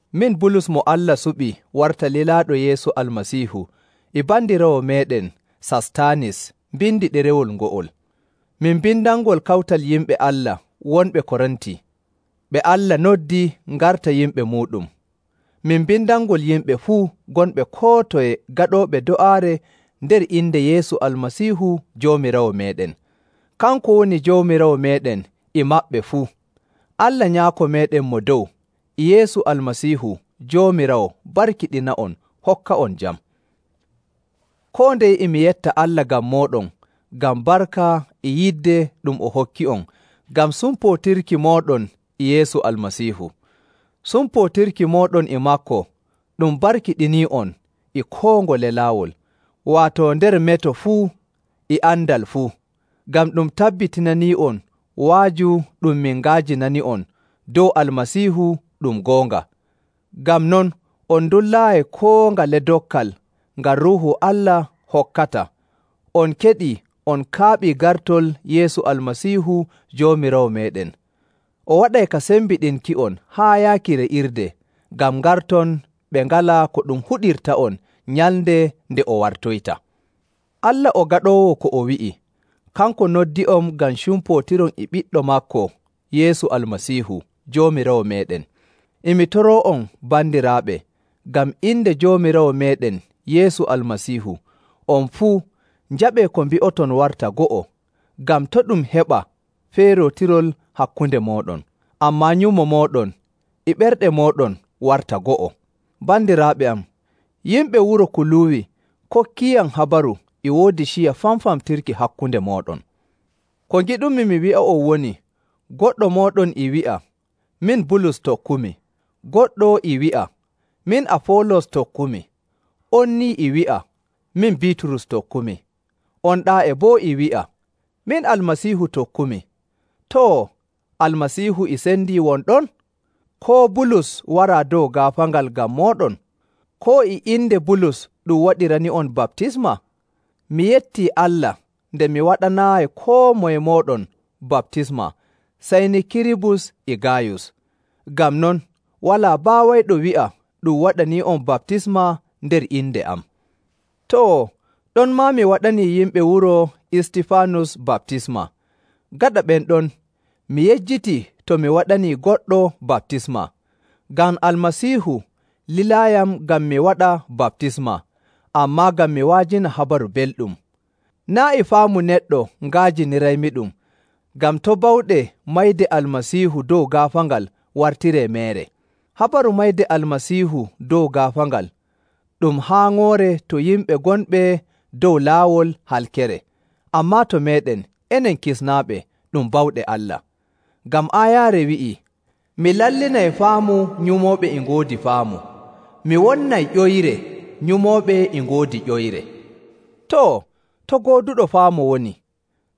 Min, Bulus mo Allah suɓi warta lilaaɗo Yeesu Almasiihu e bandiraawo meeɗen Sastaanis mbindi ɗerewol ngo'ol. Min mbindanngol kawtal yimɓe Allah wonɓe Korinti, ɓe Allah noddi ngarta yimɓe muuɗum. Min mbindanngol yimɓe fuu gonɓe koo toye gaɗooɓe do'aare nder inde Yeesu Almasiihu Joomiraawo meeɗen. Kanko woni Joomiraawo meeɗen e maɓɓe fuu. Allah Nyaako meeɗen Mo Dow e Yeesu Almasiihu Joomiraawo barkiɗina'on hokka'on jam. Koo ndeye e mi yetta Allah ngam mooɗon ngam barka e yidde ɗum o hokki'on ngam sumpootirki mooɗon e Yeesu Almasiihu. Sumpootirki mooɗon e maako ɗum barkiɗinii'on e koo ngole laawol, waato nder meto fuu e andal fuu, ngam ɗum tabbitinanii'on wa'aju ɗum min nga'ajinani'on dow Almasiihu ɗum goonga. Ngam non, on ndullaayi koo ngale dokkal ngal Ruuhu Allah hokkata, on keɗii on kaaɓii gartol Yeesu Almasiihu Joomiraawo meeɗen. O waɗay ka sembiɗinki'on haa yaaki re'irde, ngam ngarton ɓe ngalaa ko ɗum huɗirta'on nyalnde nde o wartoyta. Allah o gaɗoowo ko o wi'i. Kanko noddi'on ngam cumpootiron e Ɓiɗɗo maako Yeesu Almasiihu Joomiraawo meeɗen. E mi toroo'on bandiraaɓe ngam inde Joomiraawo meeɗen Yeesu Almasiihu, on fuu njaɓee ko mbi'oton warta go'o ngam to' ɗum heɓa feerootirol hakkunde mooɗon, ammaa nyumo mooɗon e ɓerɗe mooɗon warta go'o. Bandiraaɓe am, yimɓe wuro Kuluuwi kokkiiyam habaru e woodi ciya famfamtirki hakkunde mooɗon. Ko ngiɗumi mi wi'a woni, goɗɗo mooɗon e wi'a, “Min Bulus tokkumi.” Goɗɗo e wi'a, “Min Afoolos tokkumi,” on ni e wi'a, “Min Biiturus tokkumi.” On ɗaa'e boo e wi'a, “Min Almasiihu tokkumi.” Too, Almasiihu e sendii won ɗon? Koo Bulus waraa dow gaafaangal ngam mooɗon? Koo e inde Bulus ɗum waɗirani'on baptisma? Mi yettii Allah nde mi waɗanaayi koo moye mooɗon baptisma sey ni Kiribus e Gaayus. Ngam non, walaa baawayɗo wi'a ɗum waɗanii'on baptisma nder inde am. Too, ɗonmaa mi waɗanii yimɓe wuro Istifaanus baptisma. Gaɗa ɓen ɗon mi yejjitii to mi waɗanii goɗɗo baptisma. Ngam Almasiihu lilaayiyam ngam mi waɗa baptisma, ammaa ngam mi wa'ajina Habaru Belɗum. Naa' e faamu neɗɗo nga'ajiniraymiɗum, ngam to' bawɗe mayde Almasiihu dow gaafaangal wartiree meere. Habaru mayde Almasiihu dow gaafaangal, ɗum haaŋoore to yimɓe gonɓe dow laawol halkere. Ammaa to meeɗen enen kisnaaɓe ɗum bawɗe Allah. Ngam aayaare wi'ii, “Mi lallinay faamu nyumooɓe e ngoodi faamu; Mi wonnay ƴoyre nyumooɓe e ngoodi ƴoyre.” Too, to gooduɗo faamu woni?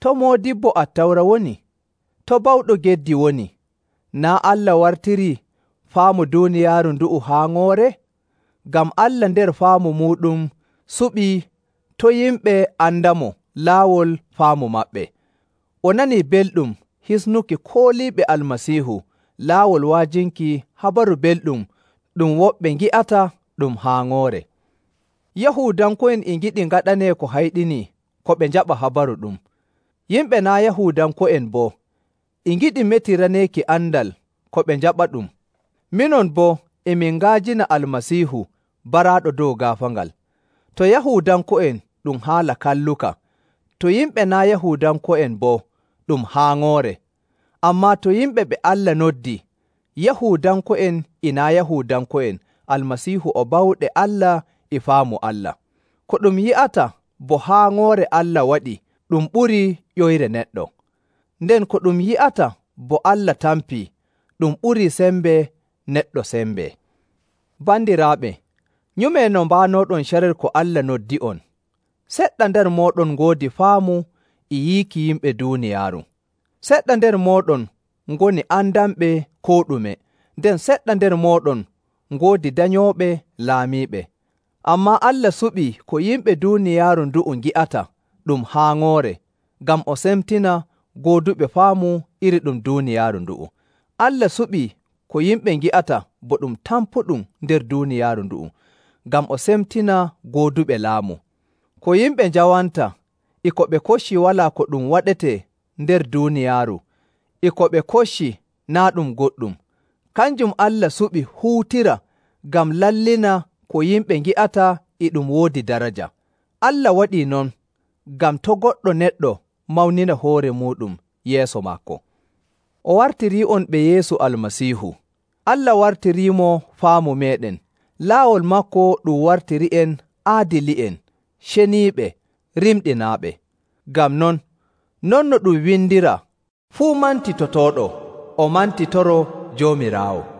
To moodibbo Attawra woni? To bawɗo geddi woni? Naa' Allah wartirii faamu duuniyaaru ndu'u haaŋoore? Ngam Allah nder faamu muuɗum suɓii to' yimɓe andamo laawol faamu maɓɓe. O nanii belɗum hisnuki kooliiɓe Almasiihu laawol wa'ajinki Habaru Belɗum ɗum woɓɓe ngi'ata ɗum haaŋoore. Yahuudanko'en e ngiɗi ngaɗanee ko hayɗinii ko ɓe njaɓa habaru ɗu'um. Yimɓe naa' Yahuudanko'en boo e ngiɗi metiraneeki andal ko ɓe njaɓaɗum. Minon boo, e min nga'ajina Almasiihu baraaɗo dow gaafaangal. To Yahuudanko'en ɗum haala kalluka, to yimɓe naa' Yahuudanko'en boo ɗum haaŋoore. Ammaa to yimɓe ɓe Allah noddi, Yahuudanko'en e naa' Yahuudanko'en, Almasiihu o bawɗe Allah e faamu Allah. Ko ɗum yi'ata bo haaŋoore Allah waɗii ɗum ɓurii ƴoyre neɗɗo. Nden ko ɗum yi'ata bo Allah tampii, ɗum ɓurii sembe neɗɗo sembe. Bandiraaɓe, nyumee no mbaanooɗon carel ko Allah noddi'on. Seɗɗa nder mooɗon ngoodi faamu e yiiki yimɓe duuniyaaru. Seɗɗa nder mooɗon ngoni andanɓe koo ɗume, nden seɗɗa nder mooɗon ngoodi danyooɓe laamiiɓe. Ammaa Allah suɓii ko yimɓe duuniyaaru ndu'u ngi'ata ɗum haaŋoore, ngam o semtina gooduɓe faamu iri ɗum duuniyaaru ndu'u. Allah suɓii ko yimɓe ngi'ata bo ɗum tampuɗum nder duuniyaaru ndu'u ngam o semtina gooduɓe laamu. Ko yimɓe njawanta, e ko ɓe kocci walaa ko ɗum waɗetee nder duuniyaaru, e ko ɓe kocci naa' ɗum goɗɗum, kanjum Allah suɓi huutira ngam lallina ko yimɓe ngi'ata e ɗum woodi daraja. Allah waɗii non ngam to' goɗɗo neɗɗo mawnina hoore muuɗum yeeso maako. O wartirii'on ɓe Yeesu Almasiihu. Allah wartiriimo faamu meeɗen. Laawol maako ɗum wartiri'en aadili'en, ceniiɓe, rimɗinaaɓe. Ngam non, non no ɗum windiraa, “Fuu mantitotooɗo, o mantitoroo Joomiraawo.”